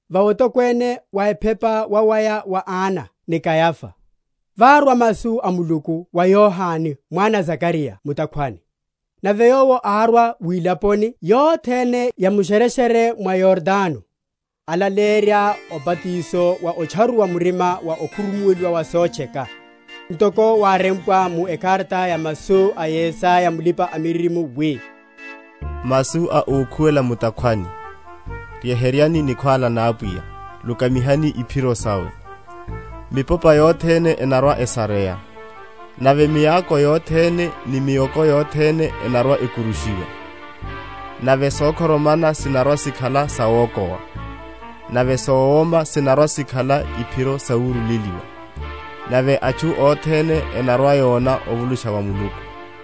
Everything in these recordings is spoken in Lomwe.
va otokwene wa ephepa wawaya wa Ana ni Kayafa, várwa masu a Muluku wa Yohane mwana a Zakariya mu’takhwani. Nave yowo árwa wilaponi yothene ya mu’shereshere mwa Yordano, alaleyerya obatiso wa otcharuwa murima wa okhurumuwela wa sotcheka; ntoko wárempwa mu ekarata ya masu a Yesaya mulipa‐miririmo, wi, Masu a ókhuwela mu’takhwani, Ryeheryani nikhwála na Apwiya, Lukamihani iphiro sawe. Mipopa yothene enarwa‐esareya, Nave miako yothene ni mioko yothene enarwa‐ekurushiwa; Nave sokhoromana sinarwa‐sikhala sawokowa, Nave sowoma sinarwa‐sikhala iphiro sawurule?-?liwa; Nave atchu othene enarwa‐yona ovulusha wa Muluku.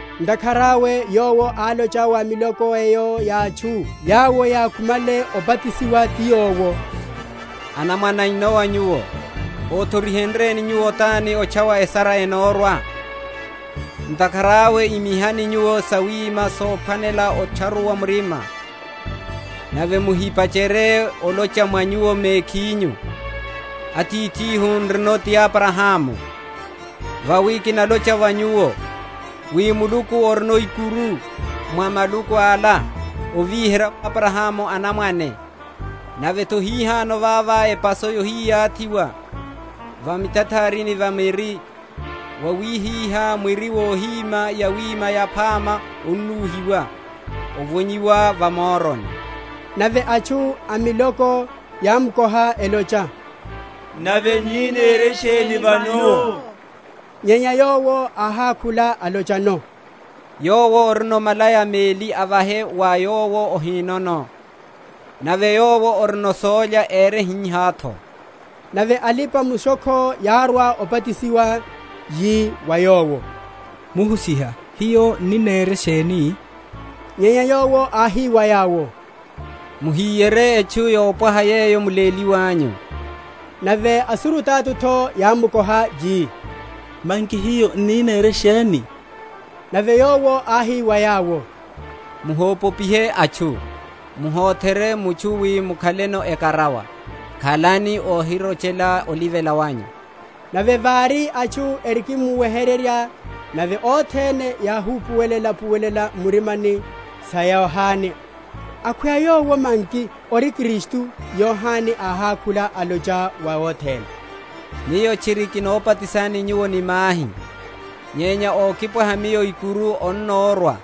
Ntakhara awe yowo álocha wa miloko eyo ya atchu yawo yákhumale obatisiwa ti yowo, Anamwane a inowa nyuwo, othorihenryeni nyuwo tani otchawa esara enamórwa? Ntakhara awe imihani nyuwo sawima sophwanela otcharuwa murima, nave muhipacherye olocha mwa nyuwo mekhinyu, Atithihu n’rino ti Abrahamu: vawi kinalocha wa nyuwo, wi Muluku arino ikuru, mwa maluku ala, ovíherya Abrahamu anamwane. Nave’tho hihano vava epaso yohiyathiwa va mutatharini va miri; wawihihá mwiri wohíma yawima yaphama onúhiwa, ovonyiwa va moroni. Nave atchu a miloko yámkoha, elocha, Nave n’ni nere sheni vano? Nyenya yowo áhákhula alochano, Yowo orino malaya meli avahe wa yowo ohinono; nave yowo orino sólya ere hihá’tho. Nave alipa‐mushokho yárwa obatisiwa, yi wa yowo, Muhusiha, hiyo n’ni nere sheni? Nyenya yowo áhi wa yawo, Muhíyerye etchu yopwaha yeyo muléliwanyu. Nave asurutato’tho yámkoha, yi, Manki hiyo n’ni nere sheni? Nave yowo áhi wa yawo, Muhopopihe atchu, muhotherye mutchu wi mwakhele ekarawa; khalani ohirochela olivela wanyu. Nave vári atchu erikimuweherya, nave othene yáhupuwela‐upuwela m’mirima’ya sa Yohane, akhweya yowo manki ori Kristu; Yohane áhákhula, alocha wa othene, Miyo tchiri kinobatisani nyuwo ni mahi; nyenya ókipwaha miyo ikuru anamórwa,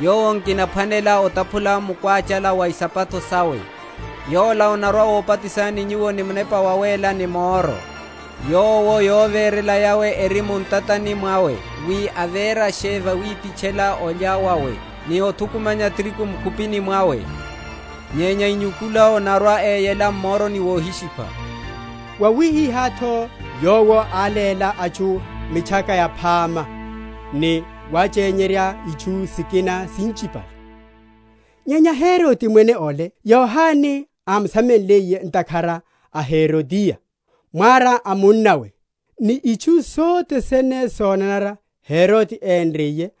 yowo nkinaphwanela otaphula mukwáchala wa isapato sawe; Yola anarwa‐obatisani nyuwo ni Munepa Wawéla ni moro: yowo yovérela yawe eri mu ntatani mwawe, wi avérashe vawipitchela olya vawe, ni othukumanya tirigu mu’khupini mwawe; nyenya inyukula anarwa‐eyela m’moroni wohishipha. Wawihiha’tho yowo áléla atchu mitchaka yaphama ni wáchenyerya itchu sikina sinchipale. Nyenya Herode mwene ole, Yohane ámusamenliye, ntakhara a Herodiya, mwara a munnawe, ni itchu sothene sonanara Herode énriye,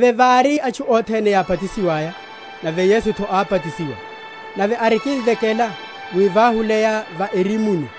Nave vári atchu othene yábatisiwaya, nave Yesu’tho ábatisiwa, nave arikimvekela, wi váhuleya va erimuni,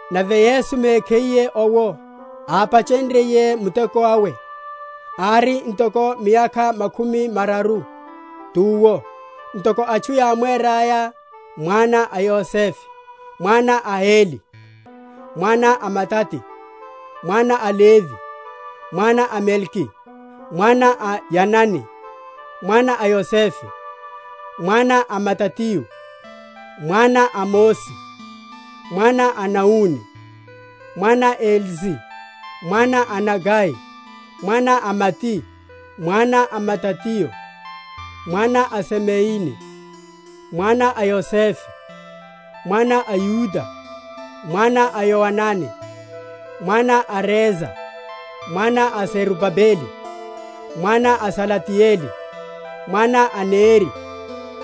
Nave Yesu mekhiye owo, ápachenryiye muteko awe, ári ntoko miyakha makhumi mararu, tuwo (ntoko atchu yámweraya) mwana a Yosefe, mwana a Heli, mwana a Matati, mwana a Levi, mwana a Melki, mwana a Yanai, mwana a Yosefe, mwana a Matatio, mwana a Amosi, mwana a Naumi, mwana a Esli, mwana a Nagai, mwana a Maati, mwana a Matatio, mwana a Semeini, mwana a Yosefe, mwana a Yuda, mwana a Yoanani, mwana a Resa, mwana a Zerubabeli, mwana a Salatieli, mwana a Neri,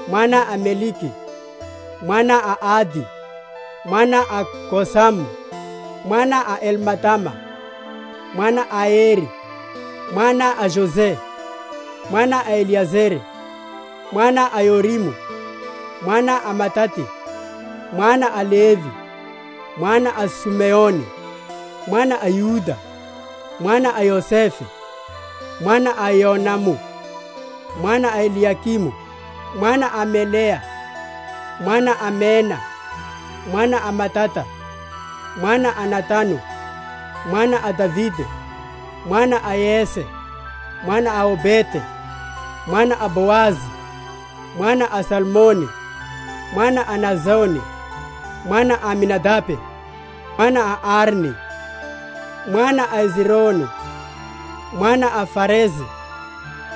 mwana a Melki, mwana a Adi, mwana a Kosamu, mwana a Elmadama, mwana a Ere, mwana a Jose, mwana a Eliezere, mwana a Yorimu, mwana a Matati, mwana a Levi, mwana a Sumeoni, mwana a Yuda, mwana a Yosefe, mwana a Yonamu, mwana a Eliyakimu, mwana a Melea, mwana a Mena, mwana a Matata, mwana a Natanu, mwana a Davide, mwana a Yese, mwana a Obede, mwana a Boazi, mwana a Salmoni, mwana a Naasoni, mwana a Aminadabe, mwana a Arni, mwana a Ezronu, mwana a Farese,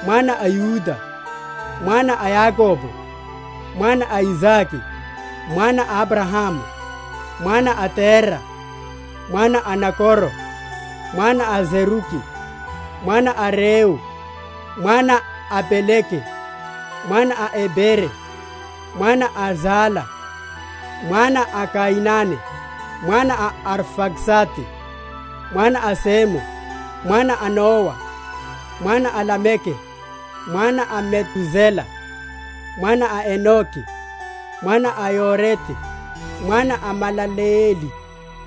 mwana a Yuda, mwana a Yakobo, mwana a Isake, mwana a Abrahamu, mwana a Tera, mwana a Nakoro, mwana a Seruki, mwana a Reu, mwana a Pelege, mwana a Ebere, mwana a Sala, mwana a Kainane, mwana a Arfaksadi, mwana a Semu, mwana a Nowa, mwana a Lameke, mwana a Metusela, mwana a Enoke, mwana a Yarede, mwana a Malaleeli,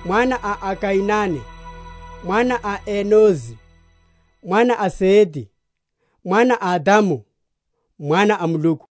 mwana a Kainane, mwana a Enosi, mwana a Sete, mwana a Adamu, mwana a Muluku.